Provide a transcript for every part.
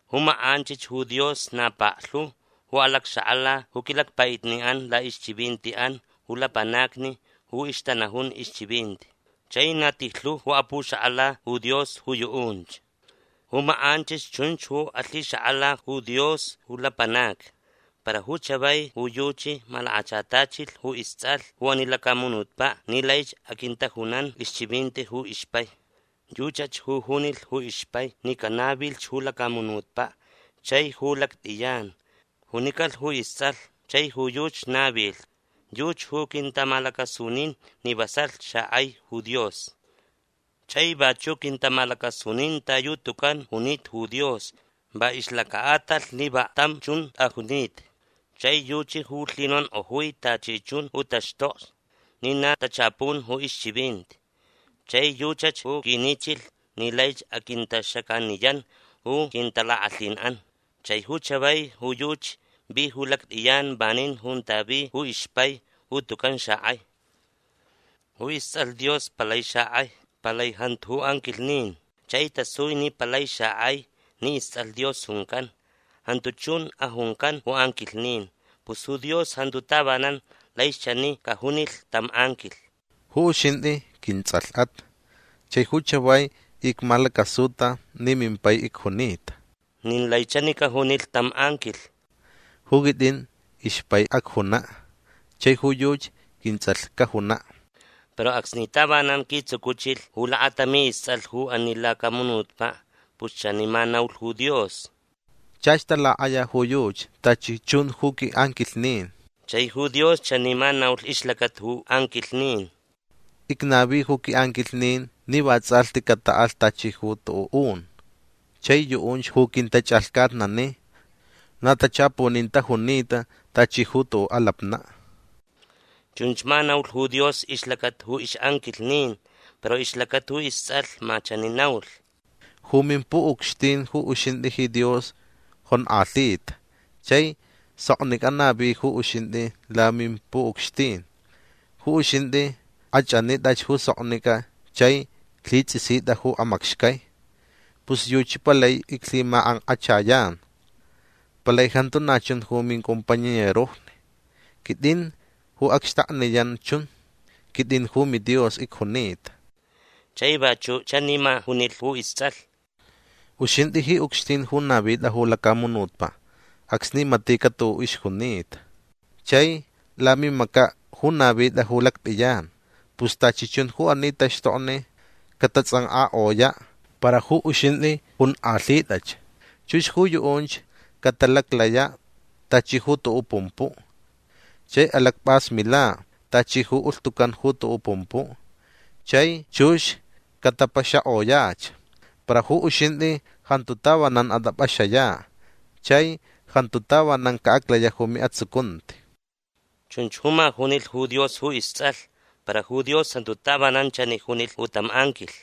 Ju makʼanchich ju Dios na paklhu ju alacxakʼala ju quilacpaʼitniʼan laʼixchivintiʼan ju lapanacni ju ixtanajun ixchivinti. Chai na tijlhu ju apuxakʼala ju Dios ju yuʼunch. Ju makʼanchich chunch ju alhixakʼala ju Dios ju lapanacni. Para ju chavai ju yuchi malakachatachilh ju istsʼalh ju ani lacamunutpaʼ ni laich aquintajunan ixchivinti ju ixpai. Yuchach ju junilh ju ixpai ni canavilh ju lacamunutpaʼ chai ju lactʼiyan. Junicalh ju istsʼalh. Chai ju yuchi navilh. Yuchi ju quintamalacasunin ni vasalh xakʼai ju Dios. Chai vachuʼ quintamalacasunin ta yu tucan junita ju Dios va ixlacaʼatalh ni vaklhtam chun tʼajunita. Chai yuchi ju lhinonkʼojui tachi chun ju taxtokni ni na tachapun ju ixchivinti. Chai yuchach ju quinichilh ni laich aquintaxacaniyan ju quintalakʼalhinʼan. Chai ju chavai ju yuchi vi ju lactʼiyan vanin junta vi ju ixpai ju tucan xakʼai. Ju istsʼalh Dios palai xakʼai. Palai jantu ju anquilhnin. Chai tasui ni palai xakʼai ni istsʼalh Dios juncan. Jantu chun ajuncan ju anquilhnin. Pus ju Dios jantu tavanan laich chani cajunilh tam anquilh: Ju uxintʼi quintsʼalhʼat. Chai ju chavai icmalacasuta ni mimpai icjunita. Nin lai chani cajunilh tam anquilh: Ju quitʼin ixpai acjunaʼ. Chai ju yuchi quintsʼalh cajunaʼ. Para acsni tavanan quitsucuchilh ju lakatami istsʼalh ju ani lacamunutpaʼ pus chani ma naulh ju Dios: Chach talakʼaya ju yuchi tachi chun ju quiʼanquilhnin. Chai ju Dios chani ma naulh ixlacata ju anquilhnin: Icnavi ju quiʼanquilhnin ni vatsʼalhti cataʼalh tachi ju tuʼuʼ un. Chai yuʼunch ju quintachʼalhcatnani. Na tachapunin tajunita tachi ju tuʼuʼ alapnaʼ. Chunch ma naulh ju Dios ixlacata ju ixʼanquilhnin. Para ixlacata ju istsʼalh ma chani naulh: Ju mimpuʼucxtin ju uxintʼi ji Dios jonkʼalhita. Chai soknicʼa navi ju uxintʼi lamimpuʼucxtin. Ju uxintʼi kʼachʼanitʼach ju soknicʼa chai lhitsʼisitʼa ju amacxcai. Pus yuchi palai iclhimakʼankʼachayan. Palai jantu na chun ju mincompañerojni. Quitʼin ju acxtakniyan chun. Quitʼin ju miDios icjunita. Chai vachuʼ chani ma junilh ju istsʼalh: Uxintʼi ji ucxtin ju navitʼa ju lacamunutpaʼ acsni matiʼcaʼ tuʼuʼ ixjunita. Chai lamimacaʼ ju navitʼa ju lactʼiyan. Pus tachi chun ju ani taxtokni catatsʼankʼakʼoyaʼ. Para ju uxintʼi onkʼalhitʼach. Chux ju yuʼunch catalaclayaʼ tachi ju tuʼuʼ pumpuʼ. Chai alacpʼasmilaʼ tachi ju ulhtucan ju tuʼuʼ pumpuʼ. Chai chux catapaxakʼoyach. Para ju uxintʼi jantu tavanan atʼapʼaxayaʼ. Chai jantu tavanan caʼaclayaʼ ju miʼatsucunti. Chunch ju ma junilh ju Dios ju istsʼalh. Para ju Dios jantu tavanan chani junilh ju tam anquilh: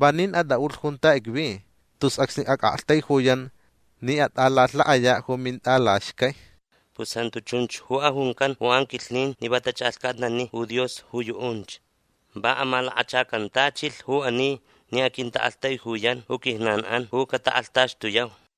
Vanin atʼaʼulh junta icvi tus acsni acʼaktaijuyan ni atʼalalhaʼayaʼ ju mintʼalaxcai. Pus jantu chunch ju ajuncan ju anquilhnin ni va tachʼalhcatnani ju Dios ju yuʼunch. Va amalakachacantachilh ju ani ni aquintaʼaktaijuyan ju quijnanʼan ju catakʼalhtaxtuyau.